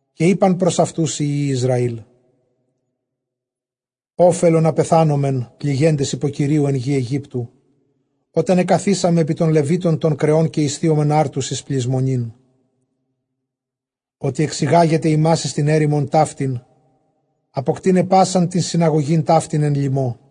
Καὶ εἶπεν πρὸς αὐτοὺς οἱ υἱοὶ Ἰσραήλ, ὄφελον ἀπεθάνομεν πληγέντες ὑπὸ Κυρίου ἐν γῇ Αἰγύπτῳ, ὅταν ἐκαθίσαμεν ἐπὶ τῶν λεβήτων τῶν κρεῶν, καὶ ἠσθίομεν ἄρτους εἰς πλησμονήν· ὅτι ἐξηγάγετε ἡμᾶς εἰς τὴν ἔρημον ταύτην, ἀποκτεῖναι πᾶσαν τὴν συναγωγὴν ταύτην ἐν λιμῷ.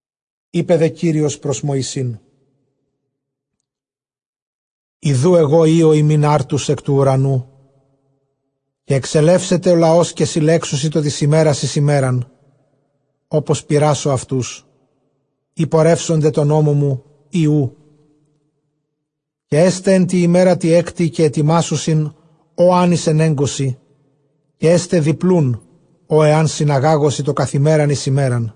Εἶπε δὲ Κύριος πρὸς Μωυσῆν, ἰδοὺ ἐγὼ ὕω ὑμῖν ἄρτους ἐκ τοῦ οὐρανοῦ· καὶ ἐξελεύσεται ὁ λαὸς, καὶ συλλέξουσι τὸ τῆς ἡμέρας εἰς ἡμέραν, ὅπως πειράσω αὐτοὺς εἰ πορεύσονται τῷ νόμῳ μου, ἢ οὔ· Καὶ ἔσται ἐν τῇ ἡμέρᾳ τῇ ἕκτῃ, καὶ ἑτοιμάσουσιν ὃ ἐὰν εἰσενέγκωσι· καὶ ἔσται διπλοῦν ὃ ἐὰν συναγάγωσι τὸ καθʼ ἡμέραν εἰς ἡμέραν.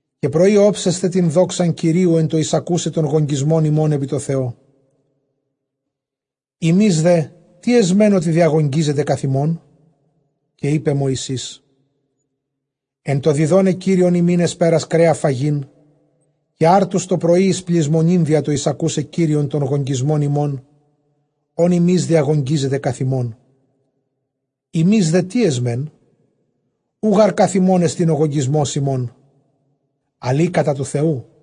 καὶ πρωῒ ὄψεσθε τὴν δόξαν Κυρίου ἐν τῷ εἰσακοῦσαι τὸν γογγυσμὸν ὑμῶν ἐπὶ τῷ Θεῷ· ἡμεῖς δὲ τί ἐσμεν, ὅτι διαγογγύζετε καθʼ ἡμῶν; Καὶ εἶπε Μωυσῆς, ἐν τῷ διδόναι Κύριον ὑμῖν ἑσπέρας κρέα φαγεῖν, καὶ ἄρτους τὸ πρωῒ εἰς πλησμονὴν, διὰ τὸ εἰσακοῦσαι Κύριον τὸν γογγυσμὸν ὑμῶν, ὃν ὑμεῖς διαγογγύζετε καθʼ ἡμῶν· ἡμεῖς δὲ τί ἐσμεν; οὐ γὰρ καθʼ ἡμῶν ἐστιν ὁ γογγυσμὸς ὑμῶν, ἀλλʼ ἢ κατὰ τοῦ Θεοῦ.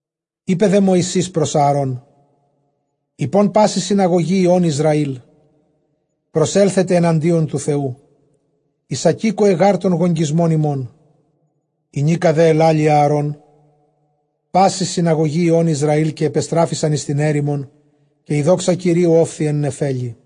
Εἶπε δὲ Μωυσῆς πρὸς Ἀαρὼν, εἶπον πάσῃ συναγωγῇ υἱῶν Ἰσραὴλ, προσέλθετε ἐναντίον τοῦ Θεοῦ· εἰσακήκοε γὰρ τὸν γογγυσμὸν ὑμῶν. Ἡνίκα δὲ ἐλάλει Ἀαρὼν πάσῃ συναγωγῇ υἱῶν Ἰσραὴλ, καὶ ἐπεστράφησαν εἰς τὴν ἔρημον, καὶ ἡ δόξα Κυρίου ὤφθη ἐν νεφέλῃ.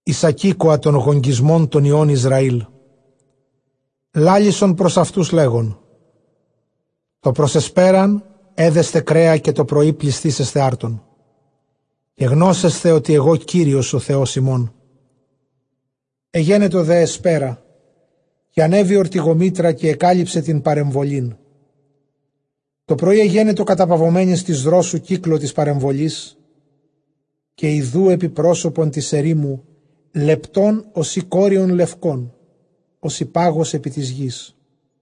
εἰσακήκοα τὸν γογγυσμὸν τῶν υἱῶν Ἰσραήλ· λάλησον πρὸς αὐτοὺς, λέγων, τὸ πρὸς ἑσπέραν ἔδεσθε κρέα, καὶ τὸ πρωῒ πλησθήσεσθε ἄρτων· καὶ γνώσεσθε, ὅτι ἐγὼ Κύριος ὁ Θεὸς ὑμῶν. Ἐγένετο δὲ ἑσπέρα· καὶ ἀνέβη ὀρτυγομήτρα, καὶ ἐκάλυψε τὴν παρεμβολήν· τὸ πρωῒ ἐγένετο καταπαυομένης τῆς δρόσου κύκλῳ τῆς παρεμβολῆς. Καὶ ἰδοὺ ἐπὶ πρόσωπον τῆς ἐρήμου λεπτὸν ὡσεὶ κόριον λευκὸν, ὡσεὶ πάγος ἐπὶ τῆς γῆς.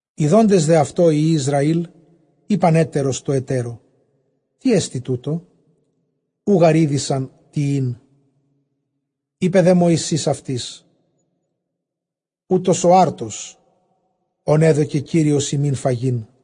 Ἰδόντες δὲ αὐτὸ οἱ υἱοὶ Ἰσραὴλ, εἶπαν ἕτερος τῷ ἑτέρῳ, τί ἐστι τοῦτο; οὐ γὰρ ᾔδεισαν τί ἦν· εἶπε δὲ Μωυσῆς αὐτοῖς, οὗτος ὁ ἄρτος, ὃν ἔδωκε Κύριος ὑμῖν φαγεῖν.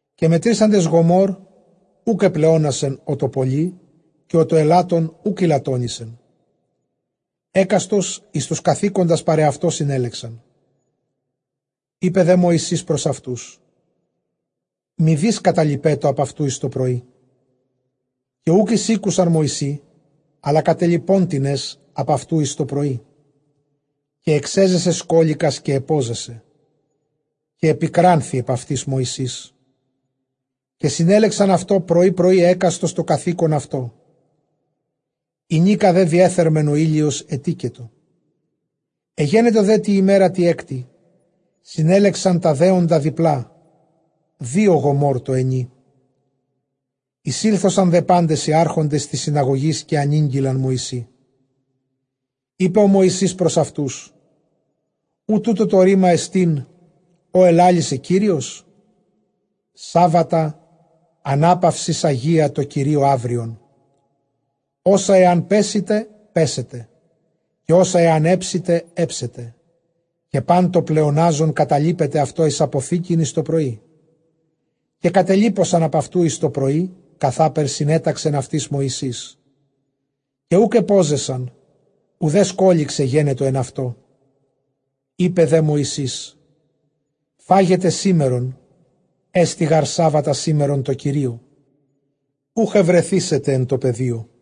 Καὶ μετρήσαντες γομὸρ, οὐκ ἐπλεόνασεν ὁ τὸ πόλυ, καὶ ὁ τὸ ἔλαττον οὐκ ἠλαττόνησεν· ἕκαστος εἰς τοὺς καθήκοντας παρʼ ἑαυτῷ συνέλεξαν. Εἶπε δὲ Μωυσῆς πρὸς αὐτοὺς, μηδεὶς καταλειπέτω ἀπʼ αὐτοῦ εἰς τὸ πρωΐ. Καὶ οὐκ εἰσήκουσαν Μωυσῆ, ἀλλὰ κατέλιπόν τινες ἀπʼ αὐτοῦ εἰς τὸ πρωΐ· καὶ ἐξέζεσε σκώληκας, καὶ ἐπώζεσε· καὶ ἐπικράνθη ἐπʼ αὐτοῖς Μωυσῆς. Καὶ συνέλεξαν αὐτὸ πρωῒ πρωῒ, ἕκαστος τὸ καθῆκον αὐτῷ· ἡνίκα δὲ διεθέρμαινεν ὁ ἥλιος, ἐτήκετο. Ἐγένετο δὲ τῇ ἡμέρᾳ τῇ ἕκτῃ, συνέλεξαν τὰ δέοντα διπλᾶ, δύο γομὸρ τῷ ἑνί· εἰσήλθοσαν δὲ πάντες οἱ ἄρχοντες τῆς συναγωγῆς, καὶ ἀνήγγειλαν Μωυσῇ. Εἶπε δὲ Μωυσῆς πρὸς αὐτούς, οὐ τοῦτο τὸ ῥῆμά ἐστιν ὃ ἐλάλησε Κύριος; σάββατα ἀνάπαυσις ἁγία τῷ Κυρίῳ αὔριον· ὅσα ἐὰν πέσσητε, πέσσετε· καὶ ὅσα ἐὰν ἕψητε, ἕψετε· καὶ πᾶν τὸ πλεονάζον καταλείπετε αὐτὸ εἰς ἀποθήκην εἰς τὸ πρωΐ. Καὶ κατελίποσαν ἀπʼ αὐτοῦ εἰς ἕως πρωῒ, καθὼς συνέταξεν αὐτοῖς Μωυσῆς· καὶ οὐκ ἐπώζεσεν, οὐδὲ σκώληξ ἐγένετο ἐν αὐτῷ. Εἶπε δὲ Μωυσῆς, φάγετε σήμερον· ἔστι γὰρ σάββατα αήμερον τῷ Κυρίῳ· οὐχ εὑρεθήσεται ἐν τῷ πεδίῳ.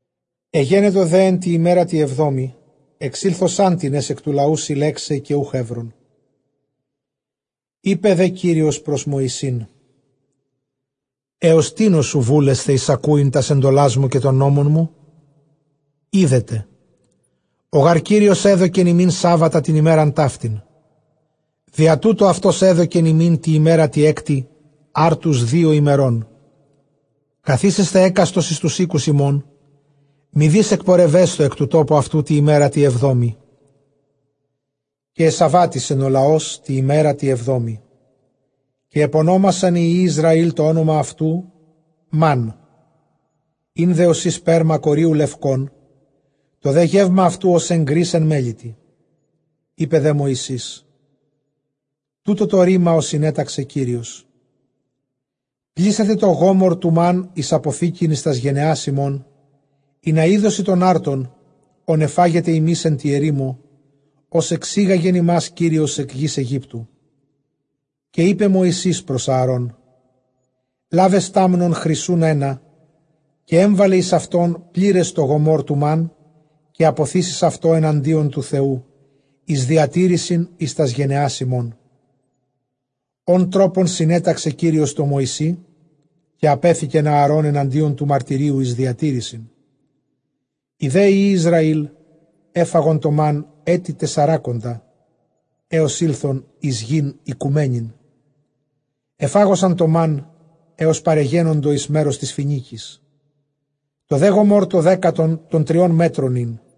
Ἐγένετο δὲ ἐν τῇ ἡμέρᾳ τῇ ἑβδόμῃ ἐξήθλοσάν τινες ἐκ τοῦ λαοῦ συλλέξαι, καὶ οὐχ εὗρον. Εἶπε δὲ Κύριος πρὸς Μωυσῆν, ἕως τίνος οὐ βούλεσθε εἰσακούειν τὰς ἐντολάς μου, καὶ τὸν νόμον μου; Ἴδετε, ὁ γὰρ Κύριος ἔδωκεν ὑμῖν σάββατα τὴν ἡμέραν ταύτην· διὰ τοῦτο αὐτὸς ἔδωκεν ὑμῖν τῇ ἡμέρᾳ τῇ ἕκτῃ ἄρτους δύο ἡμερῶν· καθίσεσθε ἕκαστος εἰς τοὺς οἴκους ὑμῶν· μηδεὶς ἐκπορευέσθω ἐκ τοῦ τόπου αὐτοῦ τῇ ἡμέρᾳ τῇ ἑβδόμῃ. Καὶ ἐσαββάτισεν ὁ λαὸς τῇ ἡμέρᾳ τῇ ἑβδόμῃ. Καὶ ἐπωνόμασαν αὐτὸ οἱ υἱοὶ Ἰσραὴλ τὸ ὄνομα αὐτοῦ, Μάν· ἦν δὲ ὡσεὶ σπέρμα κορίου λευκόν· τὸ δὲ γεῦμα αὐτοῦ ὡς ἐγκρὶς ἐν μέλιτι. Εἶπε δὲ Μωυσῆς, τοῦτο τὸ ῥῆμα, ὃ συνέταξε Κύριος, πλήσατε τὸ γομὸρ τοῦ μὰν, εἰς ἀποθήκην εἰς τὰς γενεὰς ὑμῶν· ἵνα ἴδωσι τὸν ἄρτον, ὃν ἐφάγετε ὑμεῖς ἐν τῇ ἐρήμῳ, ὡς ἐξήγαγεν ὑμᾶς Κύριος ἐκ γῆς Αἰγύπτου. Καὶ εἶπε Μωυσῆς πρὸς Ἀαρὼν, λάβε στάμνον χρυσοῦν ἕνα, καὶ ἔμβαλε εἰς αὐτὸν πλῆρες τὸ γομὸρ τοῦ μὰν, καὶ ἀποθήσεις αὐτὸ ἐναντίον τοῦ Θεοῦ, εἰς διατήρησιν εἰς τὰς γενεὰς ὑμῶν, ὃν τρόπον συνέταξε Κύριος τῷ Μωυσῇ· καὶ ἀπέθηκεν Ἀαρὼν ἐναντίον τοῦ μαρτυρίου εἰς διατήρησιν. Οἱ δὲ υἱοὶ Ἰσραὴλ ἔφαγον τὸ μὰν ἔτη τεσσαράκοντα, ἕως ἦλθον εἰς τὴν οἰκουμένην ἐφάγοσαν τὸ μὰν, ἕως παρεγένοντο εἰς μέρος τῆς Φοινίκης. Τὸ δὲ γομὸρ τὸ δέκατον τῶν τριῶν μέτρων ἦν.